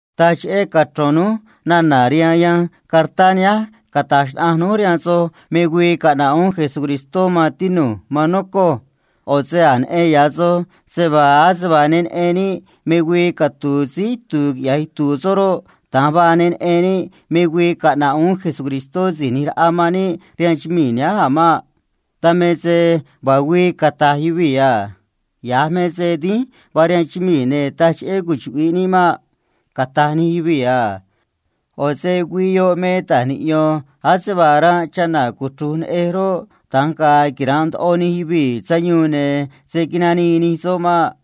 Taj cheꞌé cachro̱n núj nana̱ rihaan yanj cartá nihánj cata̱j xnaꞌanj núj rihaan soj cheꞌé me tiempó do̱ꞌ, me güii do̱ꞌ, caꞌna̱ꞌ uún Cristó, maan tinu̱j, maan nocoj. ꞌO̱ se a̱j neꞌen ya̱ soj se vaa ase vaa ne neꞌen níꞌ me güii catu̱u̱ síí itu̱u̱ quiꞌya̱j itu̱u̱ soꞌ roꞌ, da̱nj vaa ne neꞌen níꞌ me güii caꞌna̱ꞌ uún Síí ꞌNi̱j Raꞌa man níꞌ rihaan chumii̱ nihánj a̱ maꞌ. Dan me se vaa güii cata̱j yuvii̱ a: “Ya̱j me se dínj vaa rihaan chumii̱, ne̱ taj cheꞌé cuchuꞌvi̱ꞌ níꞌ maꞌ”, cata̱j nij yuvii̱ a. ꞌO̱ se güii yoꞌ me se ta̱j niꞌyo̱n ne̱ ase vaa ranꞌ chana̱ cuchru̱j neꞌej roꞌ, da̱nj ga̱a̱ quira̱nꞌ ndoꞌo nij yuvii̱ sayuun, ne̱ se̱ nanii nij soꞌ maꞌ.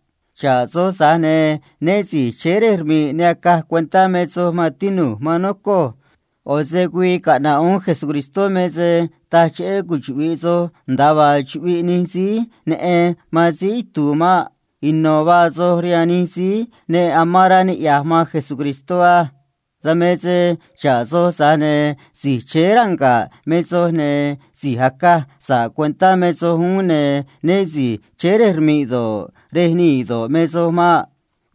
Xa̱ꞌ soj, tza̱j ne̱ né si̱j chéé rej rmi̱ꞌ ne acaj cuentá me soj, maan tinu̱j, maan nocoj. ꞌO̱ se güii caꞌna̱ꞌ uún Cristó me se taj cheꞌé cuchuꞌvi̱ꞌ soj nda̱a vaa chuꞌviꞌ nij síí neꞌen man síí itu̱u̱ maꞌ. Ino̱ vaa soj rihaan nij síí ne nocoꞌ man Cristó á. Dan me se xa̱ꞌ soj, tza̱j ne̱ si̱j chéé ranga̱ꞌ me soj, ne̱ si̱j acaj sa̱ꞌ cuentá me soj uún, ne̱ né si̱j chéé rej rmi̱ꞌ do̱ꞌ, rej nii̱ do̱ꞌ, me soj maꞌ.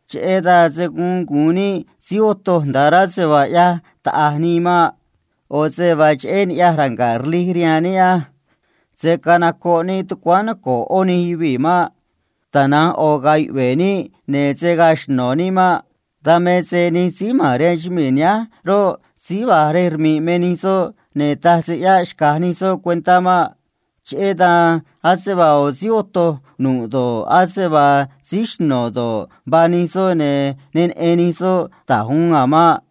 Cheꞌé dan se̱ guun gu̱un níꞌ síí otoj nda̱ꞌ rá se vaa ꞌyaj taꞌa̱j nii maꞌ. ꞌO̱ se vaa cheꞌé ni̱ꞌyaj ranga̱ꞌ rlij rihaan níꞌ á. Se̱ canocoꞌ níꞌ tucuáán noco̱ꞌ ꞌó nij yuvii̱ maꞌ. Tana̱nj ꞌo̱ ga̱a̱ yuꞌve̱ níꞌ, ne̱ se̱ gaa xno̱ níꞌ maꞌ. Dan me se nij síí ma̱n rihaan chumii̱ nihánj roꞌ, síí va̱j rej rmi̱ꞌ me nij soꞌ, ne̱ taj se ꞌyáꞌ xca̱j nij soꞌ cuentá maꞌ. Cheꞌé dan ase vaa ꞌo̱ síí otoj nu̱ꞌ do̱ꞌ, ase vaa síí xno̱ do̱ꞌ, vaa nij soꞌ, ne̱ ne neꞌen nij soꞌ da̱j uun a̱ maꞌ.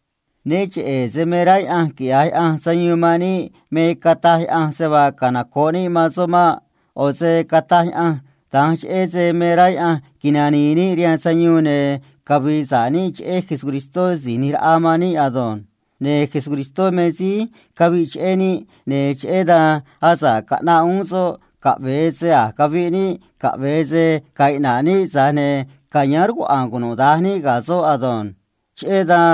Né cheꞌe̱ se me rá Yaꞌanj quiꞌya̱j Yaꞌanj sayuun man níꞌ me cataj Yaꞌanj se vaa canoco̱ꞌ níꞌ man soꞌ maꞌ. ꞌO̱ se cataj Yaꞌanj da̱nj cheꞌé se me rá Yaꞌanj nani̱i̱ níꞌ rihaan sayuun ne̱ cavi̱i̱ sa̱ꞌ níꞌ cheꞌé Jesucristó Si̱j ꞌNi̱j Raꞌa man níꞌ ado̱nj. Ne̱ Cristó me síí caviꞌ cheꞌé níꞌ, ne̱ cheꞌé dan asa̱ꞌ caꞌnaꞌ uún soꞌ caꞌve̱e se a̱j cavi̱ꞌ níꞌ, caꞌve̱e se ga̱a̱ iꞌna̱ꞌ níꞌ, tza̱j ne̱ ca̱yáán rcuaꞌa̱a̱n cunuda̱nj níꞌ ga̱ soꞌ ado̱nj. Cheꞌé dan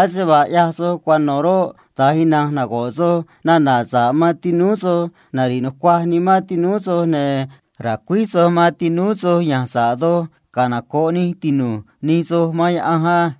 ase vaa ꞌyaj soj cuano̱ roꞌ, da̱nj na̱nj nago̱ꞌ soj nana̱ sa̱ꞌ man tinúú soj, cheꞌé rej nari̱ꞌ nucuaj nimán tinúú soj, ne̱ ra̱cuíj soj man tinúú soj yan sa̱ꞌ doj canoco̱ꞌ nij tinu̱j nij soj man Yaꞌanj á.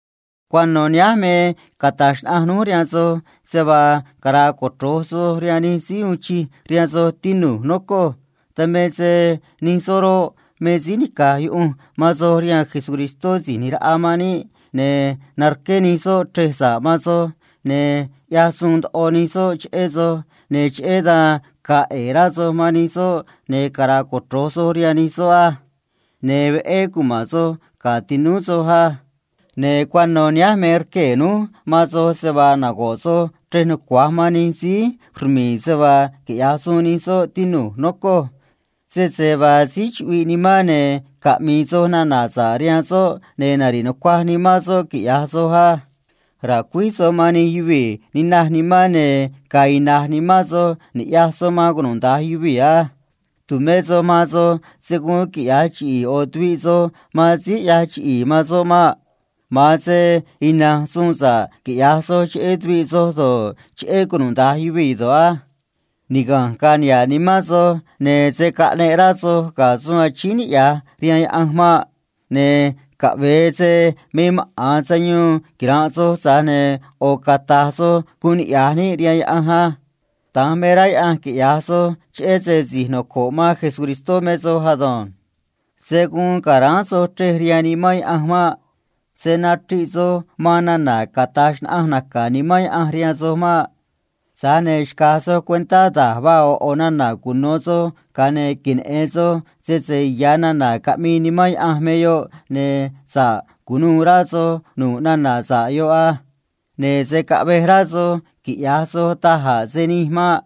Cuano̱ nihánj me cata̱j xnaꞌanj núj rihaan soj se vaa cara̱a̱ cochro̱j soj rihaan nij síí uun chij rihaan soj, tinu̱j, nocoj. Dan me se nij soꞌ roꞌ, me síí nica̱j yuꞌunj man soj rihaan Síí ꞌNi̱j Raꞌa man níꞌ, ne̱ narqué nij soꞌ chrej sa̱ꞌ man soj, ne̱ cheꞌé dan ga̱a̱ ꞌe̱e̱ rá soj man nij soꞌ, ne̱ cara̱a̱ cochro̱j soj rihaan nij soꞌ á. Ne̱ dínj cuma̱n soj ga̱ tinúú soj á. Ne̱ cuano̱ nihánj me rquee̱ núj man soj se vaa nago̱ꞌ soj chrej nucua̱j man nij síí rmi̱i̱ se vaa quiꞌya̱j suun nij soꞌ, tinu̱j, nocoj. Sese vaa síí chuꞌviꞌ nimán, ne̱ caꞌmi̱i̱ soj nana̱ sa̱ꞌ rihaan soꞌ, ne̱ nari̱ꞌ nucuaj nimán soꞌ, quiꞌya̱j soj á. Ra̱cuíj soj man nij yuvii̱ ninaj nimán, ne̱ ga̱a̱ ina̱j nimán soj ni̱ꞌyaj soj man cunuda̱nj yuvii̱ á. Tu̱mé soj man soj se̱ guun quiꞌya̱j chiꞌi̱i̱ ꞌo̱ tuviꞌ soj man síí ꞌyaj chiꞌi̱i̱ man soꞌ maꞌ. Tana̱nj ina̱nj suun sa̱ꞌ quiꞌya̱j soj cheꞌé tuviꞌ soj do̱ꞌ, cheꞌé cunuda̱nj yuvii̱ do̱ꞌ á. Niga̱nj ga̱a̱ niha̱ꞌ rá nimán soj, ne̱ se̱ caꞌneꞌ rá soj ga̱ suun achíín niꞌya̱j rihaan Yaꞌanj maꞌ. Ne̱ caꞌve̱e se me maꞌa̱n sayuun quira̱nꞌ soj, tza̱j ne̱ ꞌo̱ cata̱j soj guun niꞌya̱j níꞌ rihaan Yaꞌanj á. Da̱nj me rá Yaꞌanj quiꞌya̱j soj cheꞌé se si̱j noco̱ꞌ man Cristó Jesús me soj ado̱nj. Se̱ guun ca̱ráán soj chrej rihaan Nimán Yaꞌanj maꞌ. Se̱ nachriꞌ soj man nana̱ cata̱j xnaꞌanj naca̱ Nimán Yaꞌanj rihaan soj maꞌ. Tza̱j ne̱ xca̱j soj cuentá da̱j vaa ꞌo̱ ꞌo̱ nana̱ cuno̱ soj, ga̱a ne̱ queneꞌe̱n soj sese ya̱ nana̱ caꞌmii Nimán Yaꞌanj me yoꞌ, ne̱ sa̱ꞌ cu̱nuû rá soj nu̱ꞌ nana̱ sa̱ꞌ yoꞌ á. Ne̱ se̱ caꞌvej rá soj quiꞌya̱j soj da̱j a̱ se nij maꞌ.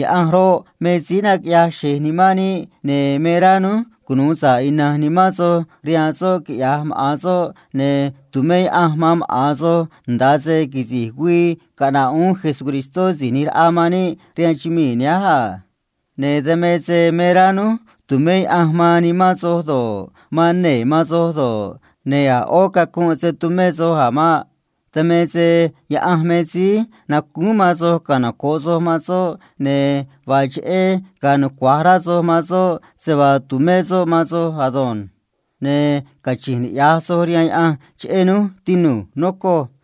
Yaꞌanj roꞌ, me síí naquiꞌyaj xe̱j nimán níꞌ, ne̱ me rá núj cunu̱u sa̱ꞌ ina̱nj nimán soj rihaan soꞌ, quiꞌya̱j maꞌa̱n soꞌ, ne̱ tu̱mé Yaꞌanj man maꞌa̱n soj nda̱a se quisi̱j güii caꞌna̱ꞌ uún Jesucristó Si̱j ꞌNi̱j Raꞌa man níꞌ a. Ne̱ dan me se me rá núj tu̱mé Yaꞌanj man nimán soj do̱ꞌ, man nee̱ man soj do̱ꞌ, ne̱ a̱ ꞌó cacunꞌ se̱ tumé soj a̱ maꞌ. Dan me se Yaꞌanj me síí nacúún man soj canoco̱ꞌ soj man soꞌ, ne̱ vaa cheꞌé ga̱a̱ nucua̱j rá soj man soꞌ se vaa tu̱mé soꞌ man soj ado̱nj. Ne̱ cachi̱nj niꞌya̱j soj rihaan Yaꞌanj cheꞌé núj, tinu̱j, nocoj.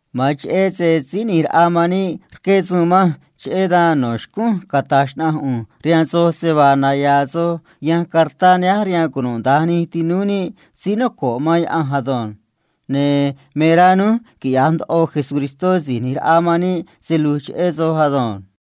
Ma̱an cheꞌé se Síí ꞌNi̱j Raꞌa man níꞌ rqué suun manj, cheꞌé dan me no̱ xcúnj cata̱j xnaꞌanj ꞌu̱nj rihaan soj se vaa naya̱a̱ soj yanj cartá nihánj rihaan cunuda̱nj nij tinúú níꞌ síí noco̱ꞌ man Cristó ado̱nj. Ne̱ me rá núj quiꞌya̱j ndoꞌo Jesucristó Si̱j ꞌNi̱j Raꞌa man níꞌ se lu̱j cheꞌé soj ado̱nj.